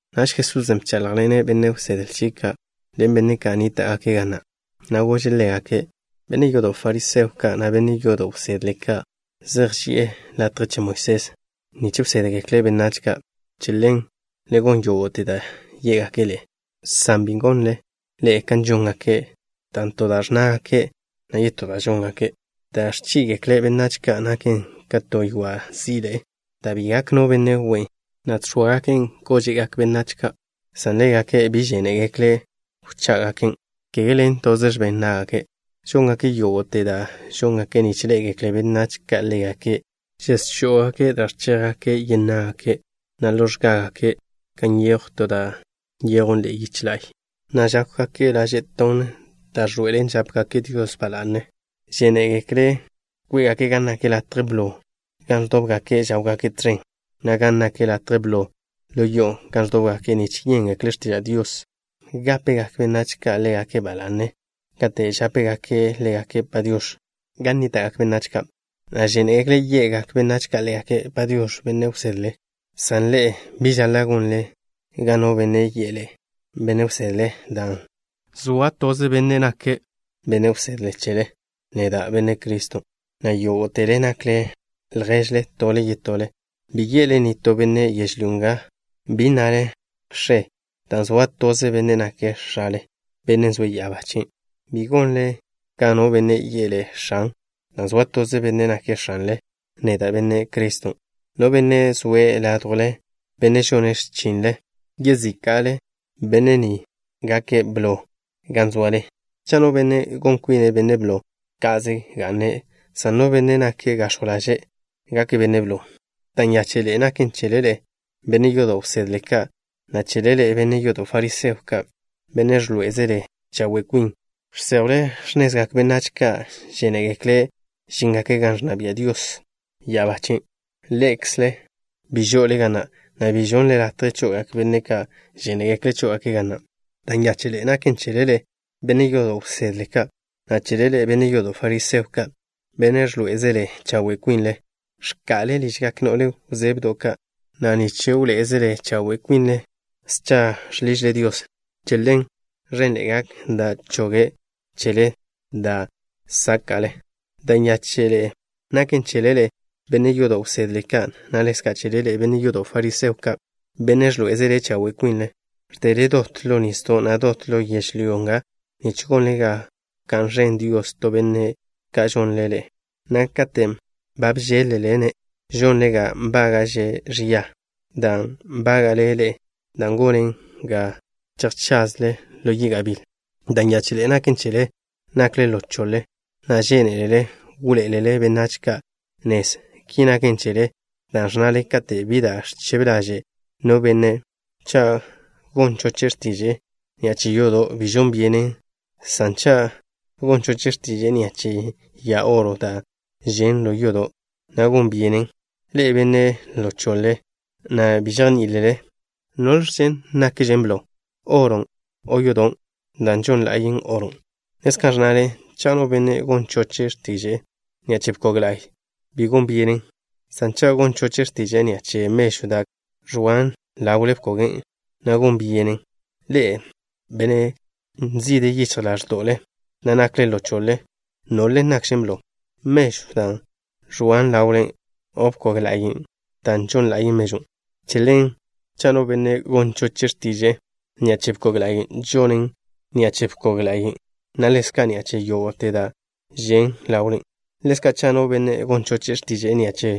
Naž Jesusen' bcháḻjḻene' benne' wsedle chie' ka', ḻen benne' ka' nníta'gake' ga na'. Na' gože' ḻégake': —Benne' yodo' fariseo ka' na' benne' yodo' wsedle ka' zej ži'e latje che Moisés, nich wsédgekle' benách ka'. Che ḻen, le gon yógo'te da' yé'gake' ḻe'e, san bi gonle ḻe'e kan žóngake', dan' to da' ẕnnágake', na' yetó da' žóngake'. Da' ẕchí'igekle' benách ka' naken ka to ywa' zí'iḻe'e da' bi gak no benne' we'e, na' ẕgó'ogaken' ža' yengak benách ka', san ḻégake' bi žénegekle' wchá'gaken', kege ḻen toze x̱ben ná'gake'. Žóngake' yógo'te da' žóngake' nich ḻé'egekle benách ka' ḻégake'. Žẕéngake' da' ẕchéjgake' yen ná'gake', na' žoa'a x̱gágake' gan nyejw to da' nyejwn ḻe'e yiche la'y, na' ẕtónngake' lože laže' da' zej nakwe', da' ẕḻoe'elen žápgake' Dios ba la'ne. Žénegekle' kwé'gake' gan nak latje blo gan ẕdóbgake' žáwgake' tẕen, na' gan nak latje blo ḻo yo'o gan ẕdóbgake' nich yéngekle' x̱tiža' Dios. Ḻezka', žénegekle' gápegak benách ka' ḻégake' ba la'ne kate' žápegake' ḻégake' “Padiox̱” gan nníta'gak benách ka', na' žénegekle' ye'gak benách ka' ḻégake': “Padiox̱, benne' wsedle.” ’San ḻe'e, bi žaḻa' gonle ga no benne' yi'e ḻe'e: “Benne' wsedle” dan' zoa toze Benne' nake' Benne' wsedle chele, neda', Benne' Cristo, na' yógo'tele nakle lježle tole yetole. Bi ye'le nitó benne' yežlyó nga, bi nnale: “X̱e” dan' zoa toze Benne' nake' X̱ale, Bennen' zoe' ya'abá chien'. Bi gonle ga no benne' yi'e ḻe'e: “X̱an” dan' zoa toze Benne' nake' X̱anle, neda', Benne' Cristo. No benne' zoe' ládjwle, benne' žone' x̱chinle yezíka'le, benne' ni gake' blo gan zoale. Cha' no benne' gon kwine' benne' blo, ka'ze ga'ne', san no benne' nake' gax̱jw ḻaže', gake' benne' blo. ’Da' nyáche'ḻe'e naken chele ḻe'e, benne' yodo' wsedle ka', na' chele ḻe'e, benne' yodo' fariseo ka', benne' ẕḻoé'ezele chawe' kwinle. Žséjwle x̱nezgak benách ka' žénegekle' žíngake' gan ẕnna bia' Dios ya'abá chien'. Ḻe'ekzle bi žo'ole ga na', na' bi žonnle latje cho'ogak benne' ka' žénegekle' chó'ogake' ga na'. ’Da' nyáche'ḻe'e naken chele ḻe'e, benne' yodo' wsedle ka', na' chele ḻe'e, benne' yodo' fariseo ka', benne' ẕḻoé'ezele chawe' kwinle. Ẕka'le ližgak no'le wzebdo' ka', na' nich wḻoé'ezele chawe' kwinle, scha žḻižle Dios. Che ḻen, ẕenḻe'e gak da' choge' chele da' sáka'le. ’Da' nyáche'ḻe'e naken chele ḻe'e, benne' yodo' wsedle ka', na' ḻezka' chele ḻe'e, benne' yodo' fariseo ka', benne' ẕḻoé'ezele chawe' kwinle. Ẕdele dot ḻo nisdo', na' dot ḻo yežlyó nga nich gonle ga wká'n ẕen Dios to benne' ka žonle ḻe'e, na' katen' ba bžéḻ-lele-ne', žonle ga nbága'že' ẕia ka dan' nbága'le ḻe'e, dan' gonen ga chejchazle ḻo yi' gabíl. ’Da' nyáche'ḻe'e naken chele. Nakle ḻo choḻe, na' žénelele wḻoé'elele benách ka' nez. Ki naken chele dan' ẕnnale: “Kate' bi da' ẕchebe ḻaže' no benne', cha' gon choche' x̱tiže'e ni'a che yodo', bi žon byenen, san cha' gon choche' x̱tiže'e ni'a che ya oro da' žen' ḻo yodo', na' gon byenen.” Ḻe'e, benne' ḻo choḻe ka', na' bi žejní'ilele. ¿Biẕle nakže blo? ¿Oron' o yodon' da' žon la'yen oron'? Ḻezka' ẕnnale: “Cha' no benne' gon choche' x̱tiže'e ni'a che bkog la'y, bi gon byenen, san cha' gon choche' x̱tiže'e ni'a che mežw da' ẕoan ḻawle bkogen', na' gon byenen.” Ḻe'e, benne' nzide yichj ḻáẕdo'le, na' nakle ḻo choḻe. ¿Biẕle nakžen blo? ¿Mežw da' ẕoan ḻawlen, o bkog ḻa'yen' da' žon la'yen mežwn'? Che ḻen, cha' no benne' gon choche' x̱tiže'e ni'a che bkog la'y, žonen' ni'a che bkog la'yen', na' ḻezka' ni'a che yógo'te da' žen' ḻawlen. Ḻezka', cha' no benne' gon choche' x̱tiže'e ni'a che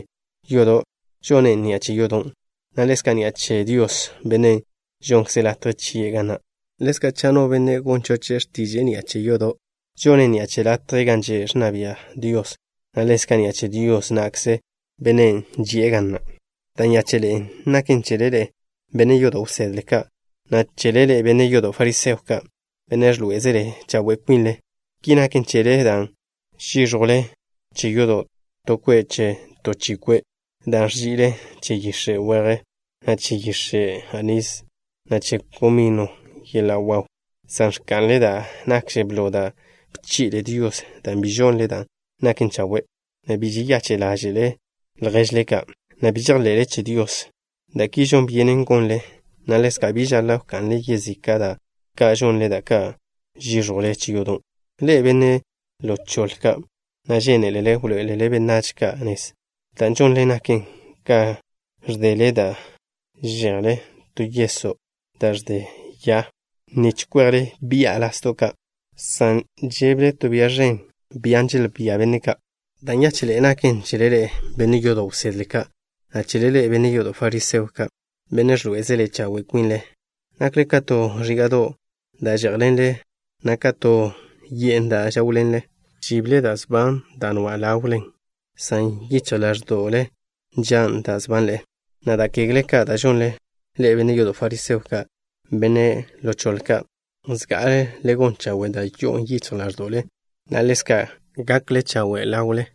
yodo', žonen' ni'a che yodon', na' ḻezka' ni'a che Dios, Bennen' žonkze' latje chie' ga na'. Ḻezka', cha' no benne' gon choche' x̱tiže'e ni'a che ya'abá che Dios, žonen' ni'a che latje gan že' ẕnna bia' Dios, na' ḻezka' ni'a che Dios na'kze, Bennen' ži'e ga na'. ’Da' nyáche'ḻe'e naken chele ḻe'e, benne' yodo' wsedle ka', na' chele ḻe'e, benne' yodo' fariseo ka', benne' ẕḻoé'ezele chawe' kwinle. Ki naken chele dan' žíẕjwle che yodo' to kwe' che to chi kwe' da' ẕzi'le che yix̱e' weje, na' che yix̱e' anís, na' che komino yeḻa' waw, san ẕka'nle da' nakže blo da' bchi'le Dios, dan' bi žonle da' naken chawe', na' bi žeyache' ḻáže'lele lježle ka', na' bi žejḻe'le che Dios. Da' ki žon byenen gonle, na' ḻezka' bi žaḻa' wka'nle yezika' da' ka' žonle, da' ka' žíẕjwle che yodo'. Ḻe'e, benne' ḻo choḻe ka', na' žénelele wḻoé'elele benách ka' nez. Dan' žonle naken ka ẕdele da' že'jle to yeso' da' ẕde ya, nich kwejle bi'a lasdo' ka', san že'jle to bia ẕen dan' želbía benne' ka'. ’Da' nyáche'ḻe'e naken chele ḻe'e, benne' yodo' wsedle ka', na' chele ḻe'e, benne' yodo' fariseo ka', benne' ẕḻoé'ezele chawe' kwinle. Nakle ka to ẕíga'do' da' žé'jḻenle, na' ka to ye'n da' žáwḻenle. Žible da' sban da' nwa' kwitle, san yichj ḻáẕdo'le nžan' da' ẕbanle, na' da' kegle ka' da' žonle. Ḻe'e, benne' yodo' fariseo ka', benne' ḻo choḻe ka'. Zga'ale le gon chawe' da' yo'on yichj ḻáẕdo'le, na' ḻezka' gakle chawe' kwitle.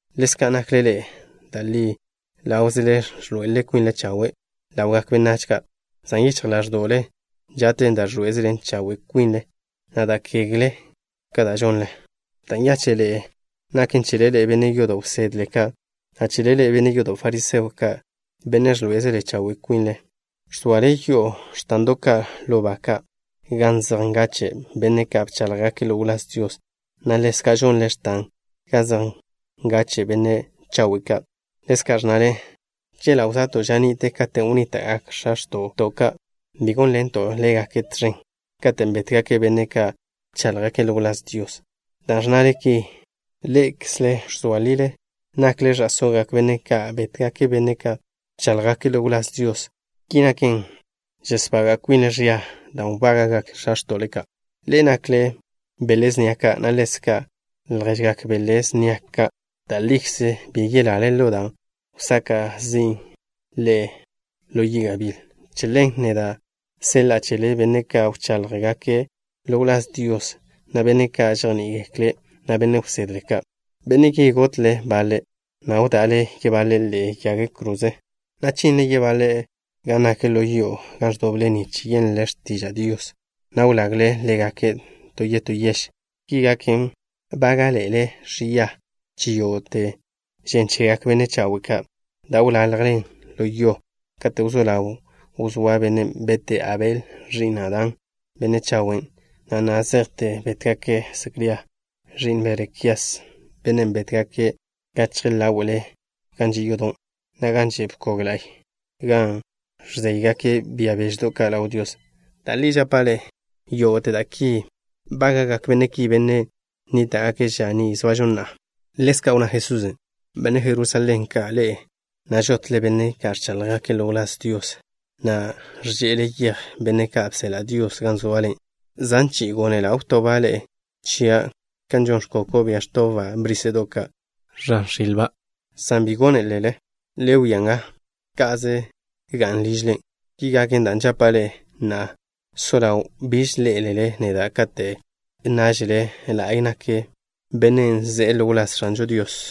Ḻezka' nakle ḻe'e. Da' li ḻáwzele ẕḻoe'el kwinle chawe' ḻawgak benách ka', san yichj ḻáẕdo'le nža'ten da' ẕḻoé'ezele chawe' kwinle, na' da' kegle ka' da' žonle. ’Da' nyáche'ḻe'e naken chele ḻe'e, benne' yodo' wsedle ka', na' chele ḻe'e, benne' yodo' fariseo ka', benne' ẕḻoé'ezele chawe' kwinle. Ẕzoale yo'o x̱tando' ka' ḻo ba ka' gan zej ngache' benne' ka' bcháḻjgake' ḻo wláz Dios, na' ḻezka' žonle x̱tan gan zej ngache' benne' chawe' ka'. Ḻezka' ẕnnale: “Chela' wzoato' ža ni'te katen' wnníta'gak x̱a x̱to'to' ka', bi gónḻento' ḻégake' tẕen katen' bétgake' benne' ka' bcháḻjgake' ḻo wláz Dios.” Dan' ẕnnale ki, ḻe'ekzle ẕzoa lile nakle ẕa'sógak benne' ka' bétgake' benne' ka' bcháḻjgake' ḻo wláz Dios. Ki naken, žesbaga' kwinle ẕia dan' wbága'gak x̱a x̱to'le ka'. ’Ḻe'e nakle ka bele snia ka', na' ḻezka' ka lježgak bele snia ka'. Da' likze bi yelale ḻo da' wsaka' zin' ḻe'e ḻo yi' gabíl. Che ḻen, neda' seḻa'a chele benne' ka' wcháḻjgake' ḻo wláz Dios, na' benne' ka' žejní'igekle', na' benne' wsedle ka'. Benne' ki, gotle baḻe', na' wda'le yebaḻe' ḻe'egak yag kroze ka', na' chinle yebaḻe' gan nak ḻo yo'o gan ẕdoble nich yenle x̱tiža' Dios, na' wlagle ḻégake' to yetó yež. Ki gaken, bága'le ḻe'e ẕia che yógo'te žen chegak benne' chawe' ka', da' wḻaljen ḻo yo, kate' wzó ḻaw wzóa bennen' bete' Abel, ẕi'n Adán, benne' chawen', na' na' zejte bétgake' Secría, ẕi'n Berekías, bennen' bétgake' gachje ḻáwe'le gan že' yodo', na' gan že' bkog la'y, gan ẕzéygake' bia beždo' ka' ḻaw Dios. Da' li žapa' ḻe'e, yógo'te da' ki bága'gak benne' ki, benne' nníta'gake' ža ni zoažo na'a. Ḻezka' wnná Jesusen': —Benne' Jerusalén ka', ḻe'e na' žotle benne' ka' ẕcháḻjgake' ḻo wláz Dios, na' ẕže'ele yej benne' ka' bseḻa' Dios gan zoale. Zan chi'i gónela' wtoba' ḻe'e chia', kan žon ẕkoko', bia ẕtobba' bríse'do' ka' ẕan x̱ilba', san bi gónelele. Le wia nga, ka'ze ga'n ližle. Ki gaken, dan' žapa' ḻe'e, na'a so ḻaw biž ḻé'elele neda' kate' nnážele: “La'y nak Bennen' ze'e ḻo wláz X̱anžo Dios.”